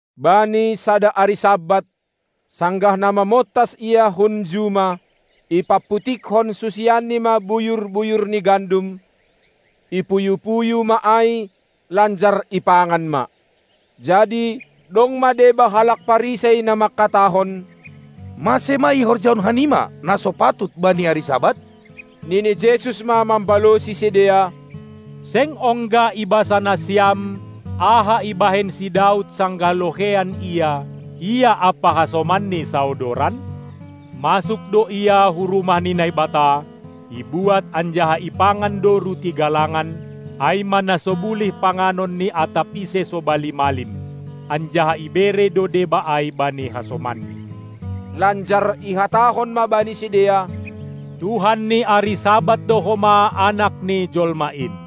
Bani sada ari Sabat, sanggah na mamontas Ia hun juma, ipamputikkon susianNi ma buyur-buyur ni gandum, ipuyu-puyu ma ai, lanjar ipangan ma. Jadi dong ma deba halak Parisei na mangkatahon: Mase ma ihorjahon hanima na so patut bani ari Sabat? Nini Jesus ma mambalosi sidea: Seng ongga ibasa nasiam aha ibahen si Daud sanggah loheian ia, ia ampa hasomanni saodoran? Masuk do ia hu rumah ni Naibata, ibuat anjaha ipangan do ruti galangan, ai ma na so bulih panganon ni atap ise sobali malim, anjaha ibere do deba ai bani hasomanni. Lanjar ihatahon ma bani sidea: Tuhan ni ari Sabat do homa Anak ni Jolma in.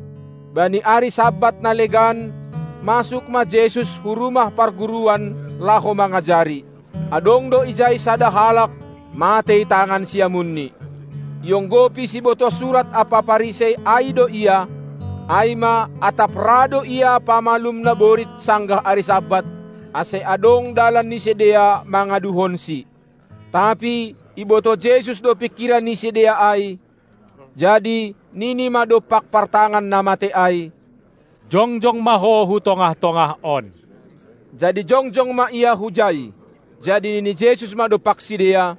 Bani ari Sabat na legan masuk ma Jesus hu rumah parguruan laho mangajari. Adong do ijai sada halak, matei tangan siamunni. Ionggopi sibotoh surat ampa Parisei ai do Ia, ai ma atap ra do Ia pamalum naborit sanggah ari Sabat, ase adong dalan ni sidea mangaduhonSi. Tapi ibotoh Jesus do pingkiran ni sidea ai, jadi nini ma dompak partangan na matei ai: Jongjong ma ho hu tongah-tongah on! Jadi jongjong ma ia hujai. Jadi nini Jesus ma dompak sidea: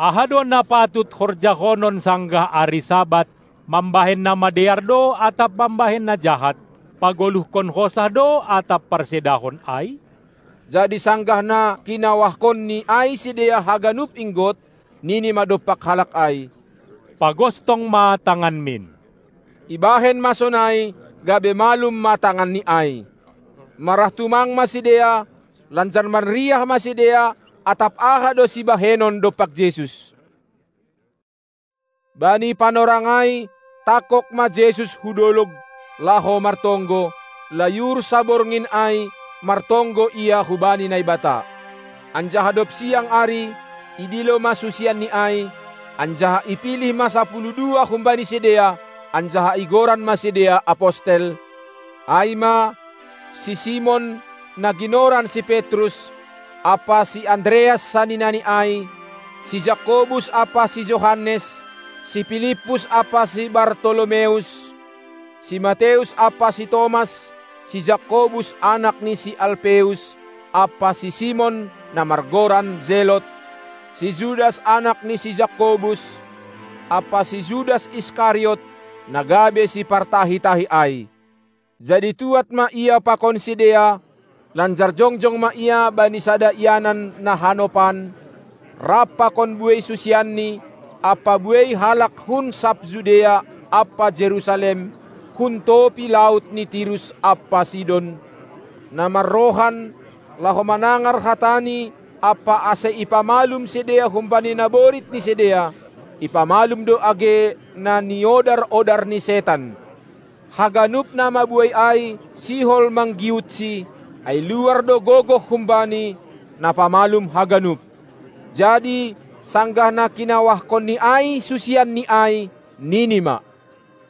Aha do na patut horjahonon sanggah ari Sabat, mambahen na madear do atap mambahen na jahat, pagoluhkon hosah do atap parsedahon ai? Jadi sanggah na kinawahkonNi ai sidea haganup inggot, nini ma dompak halak ai: Pagostong ma tanganmin! Ibahen ma sonai, gabe malum ma tanganni ai. Marah tumang ma sidea, lanjar manriah ma sidea atap aha do sibahenon dompak Jesus. Bani panorang ai tangkog ma Jesus hu dolog, laho martonggo; layur saborngin ai martonggo Ia hubani Naibata. Anjaha dob siang ari, idilo ma susianni ai, anjaha ipilih ma sapuluh dua humbani sidea, anjaha igoran ma sidea apostel, ai ma: si Simon, na ginoran si Petrus, ampa si Andreas saninani ai; si Jakobus ampa si Johannes; si Pilippus ampa si Bartolomeus; si Mateus ampa si Tomas; si Jakobus anak ni si Alpeus ampa si Simon, na margoran Zelot; si Judas anak ni si Jakobus, ampa si Judas Iskariot, na gabe sipartahi-tahi ai. Jadi tuad ma Ia pakon sidea, lanjar jongjong ma Ia bani sada ianan na hanopan, rap pakon buei susianNi ampa buei halak hun sab Judea ampa Jerusalem, hun topi laut ni Tirus ampa Sidon, na marrohan, laho manangar hataNi ampa ase ipamalum sidea humbani naborit ni sidea; ipamalum do age na niodar-odar ni setan. Haganup na mabuei ai sihol manggiutSi, ai luar do gogoh humbani, na pamalum haganup. Jadi sanggah na kinawahkonNi ai susianNi ai, nini ma: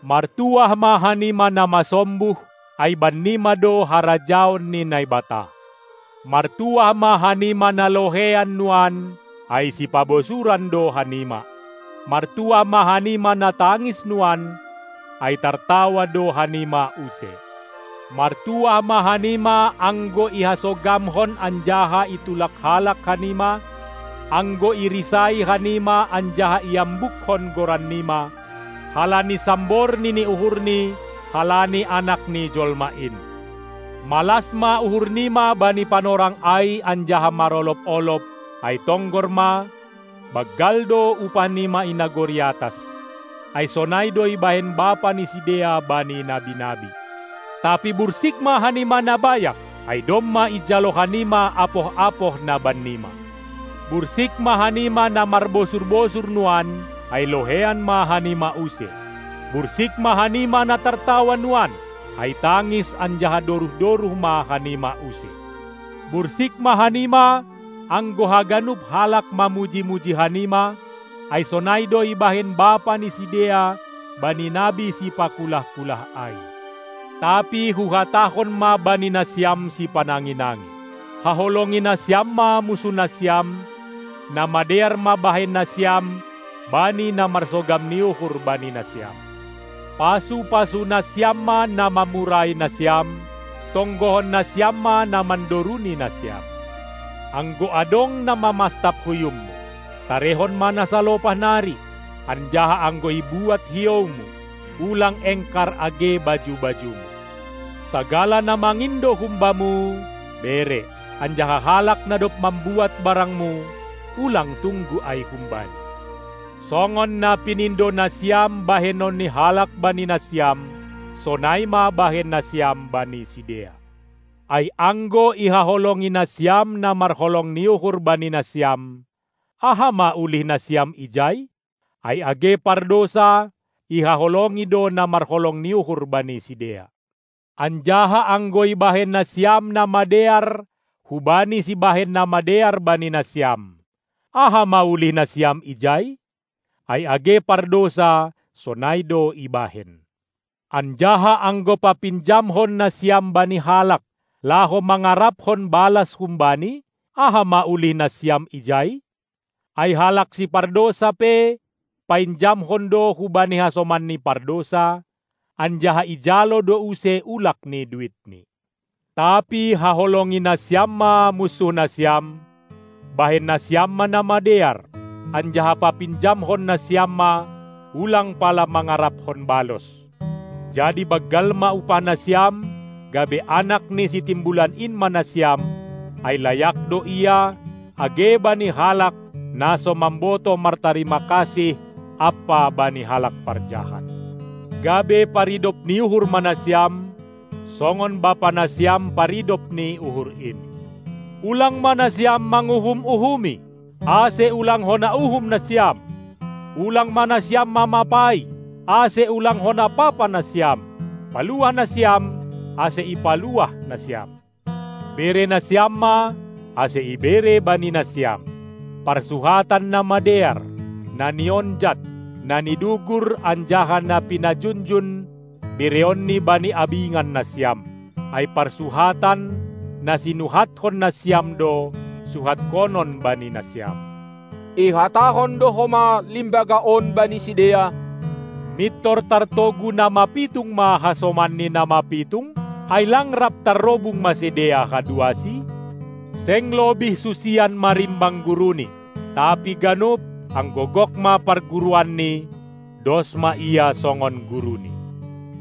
Martuah ma hanima na masombuh, ai bannima do harajaon ni Naibata! Martuah ma hanima na loheian nuan, ai sipabosuran do hanima! Martuah ma hanima na tangis nuan, ai tartawa do hanima use! Martuah ma hanima anggo ihasogamhon anjaha itulak halak hanima, anggo irisai hanima anjaha iambukkon goran nima, halani sambor nini uhurni, halani Anak ni Jolma in. Malas ma uhur nima bani panorang ai anjaha marolob-olob, ai tonggor ma, banggal do upah nima i nagori atas, ai sonai do ibahen bapa ni sidea bani nabi-nabi. Tapi bursik ma hanima na bayak, ai domma ijalo hanima apoh-apoh na bannima. Bursik ma hanima na marbosur-bosur nuan, ai loheian ma hanima use. Bursik ma hanima na tartawa nuan, ai tangis anjaha doruh-doruh ma hanima use. Bursik ma hanima, anggo haganup halak mamuji-muji hanima, ai sonai do ibahen bapa ni sidea bani nabi sipakulah-kulah ai. Tapi huhatahon ma bani nasiam sipanangi-nangi: Haholongi nasiam ma munsuh nasiam, na madear ma bahen nasiam bani na marsogam ni uhur bani nasiam. Pasu-pasu nasiam ma na mamurai nasiam, tonggohon nasiam ma na mandoruni nasiam. Anggo adong na mamastap huyummu, tarehon ma na salopah nari; anjaha anggo ibuat hioumu, ulang engkar age baju-bajumu. Sagala na mangindo humbamu, bere; anjaha halak na dob mambuat barangmu, ulang tunggu ai humbani. Songon na pinindo nasiam bahenon ni halak bani nasiam, sonai ma bahen nasiam bani sidea. Ai anggo ihaholongi nasiam na marholong ni uhur bani nasiam, aha ma ulih nasiam ijai? Ai age pardousa ihaholongi do na marholong ni uhur bani sidea. Anjaha anggo ibahen nasiam na madear hubani sibahen na madear bani nasiam, aha ma ulihnasiam ijai? Ai age pardousa sonai do ibahen. Anjaha anggo papinjamkon nasiam bani halak, laho mangarapkon balas humbani, aha ma ulih nasiam ijai? Ai halak sipardousa pe painjamkon do hubani hasomanni pardousa, anjaha ijalo do use ulak ni duitni. Tapi haholongi nasiam ma munsuhnasiam, bahen nasiam ma na madear, anjaha papinjamhon nasiam ma, ulang pala mangarapkon balos. Jadi banggal ma upah nasiam, gabe anak ni Sitimbulan in ma nasiam; ai layak do Ia, age bani halak, na so mambotoh martarima kasih ampa bani halak parjahat. Gabe paridop ni uhur ma nasiam, songon Bapa nasiam, paridop ni uhur in. Ulang ma nasiam manguhum-uhumi, ase ulang hona uhum nasiam! Ulang ma nasiam mamapai, ase ulang hona papa nasiam! Paluah nasiam, ase ipaluah nasiam! Bere nasiam ma, ase ibere bani nasiam! Parsuhatan na madear, na nionjat, na nidugur anjaha na pinajunjun bereonni bani abingan nasiam; ai parsuhatan, na sinuhatkon nasiam do, suhatkonon bani nasiam. Ihatahon do homa limbaga on bani sidea: Mintor tartogu na mapitung ma hasomanni na mapitung? Ai lang rap tarrobung ma sidea haduasi? Seng lobih susian marimbang guruni; tapi ganup, anggo gok ma parguruanni, dos ma ia songon guruni.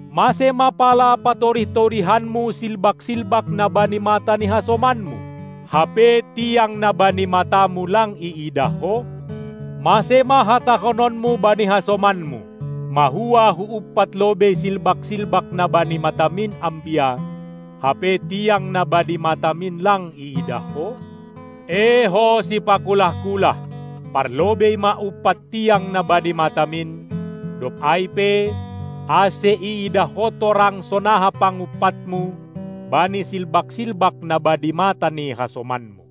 Mase ma pala patorih-torihanmu silbak-silbak na bani mata ni hasomanmu, hape tiang na bani matamu lang iidah ho? Mase ma hatahononmu bani hasomanmu: Mahua huumpat lobei silbak-silbak na bani matamin, ambia, hape tiang na bani matamin lang iidah ho? Ee ho sipakulah-kulah, parlobei ma umpat tiang na bani matamin, dob ai pe, ase iidah ho torang sonaha pangumpatmu bani silbak-silbak na bani mata ni hasomanmu.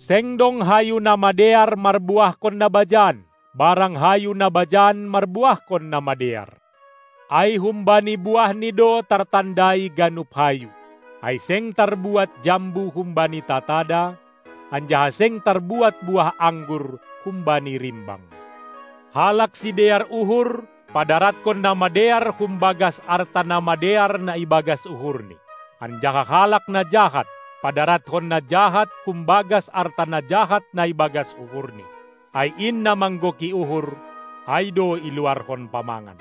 Seng dong hayu na madear marbuahkon na bajan, barang hayu na bajan marbuahkon na madear. Ai humbani buahni do tartandai ganup hayu. Ai seng tarbuat jambu humbani tatada, anjaha seng tarbuat buah anggur humbani rimbang. Halak sidear uhur padaratkon na madear humbagas arta na madear na ibagas uhurni; anjaha halak na jahat padarathon na jahat humbagas arta na jahat na ibagas uhurni. Ai in na manggoki uhur, ai do iluarhon pamangan.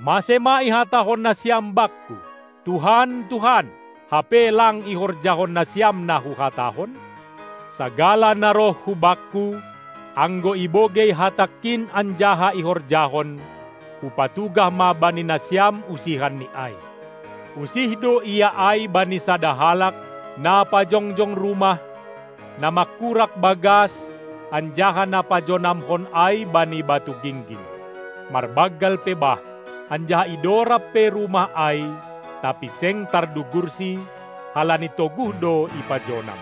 Mase ma ihatahon nasiam Bakku: Tuhan, Tuhan! hape lang ihorjahon nasiam na Huhatahon? Sagala na roh hu Bakku, anggo ibogei hatangKin anjaha ihorjahon, Hupatugah ma bani nasiam usihanni ai: Usih do ia ai bani sada halak, na pajongjong rumah, na mangkurak bagas anjaha na pajonamhon ai bani batu gingging. Marbanggal pe bah, anjaha idorab pe rumah ai, tapi seng tardugursi, halani toguh do ipajonam.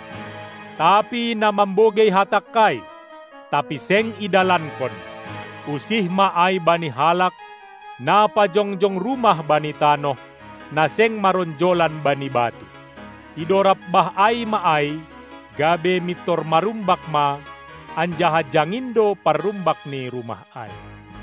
Tapi na mambogei hatangKai, tapi seng idalankon, usih ma ai bani halak, na pajongjong rumah bani tanoh, na seng maronjolan bani batu; idorab bah ai ma ai, gabe mintor marumbak ma, anjaha jangin do parrumbak ni rumah ai.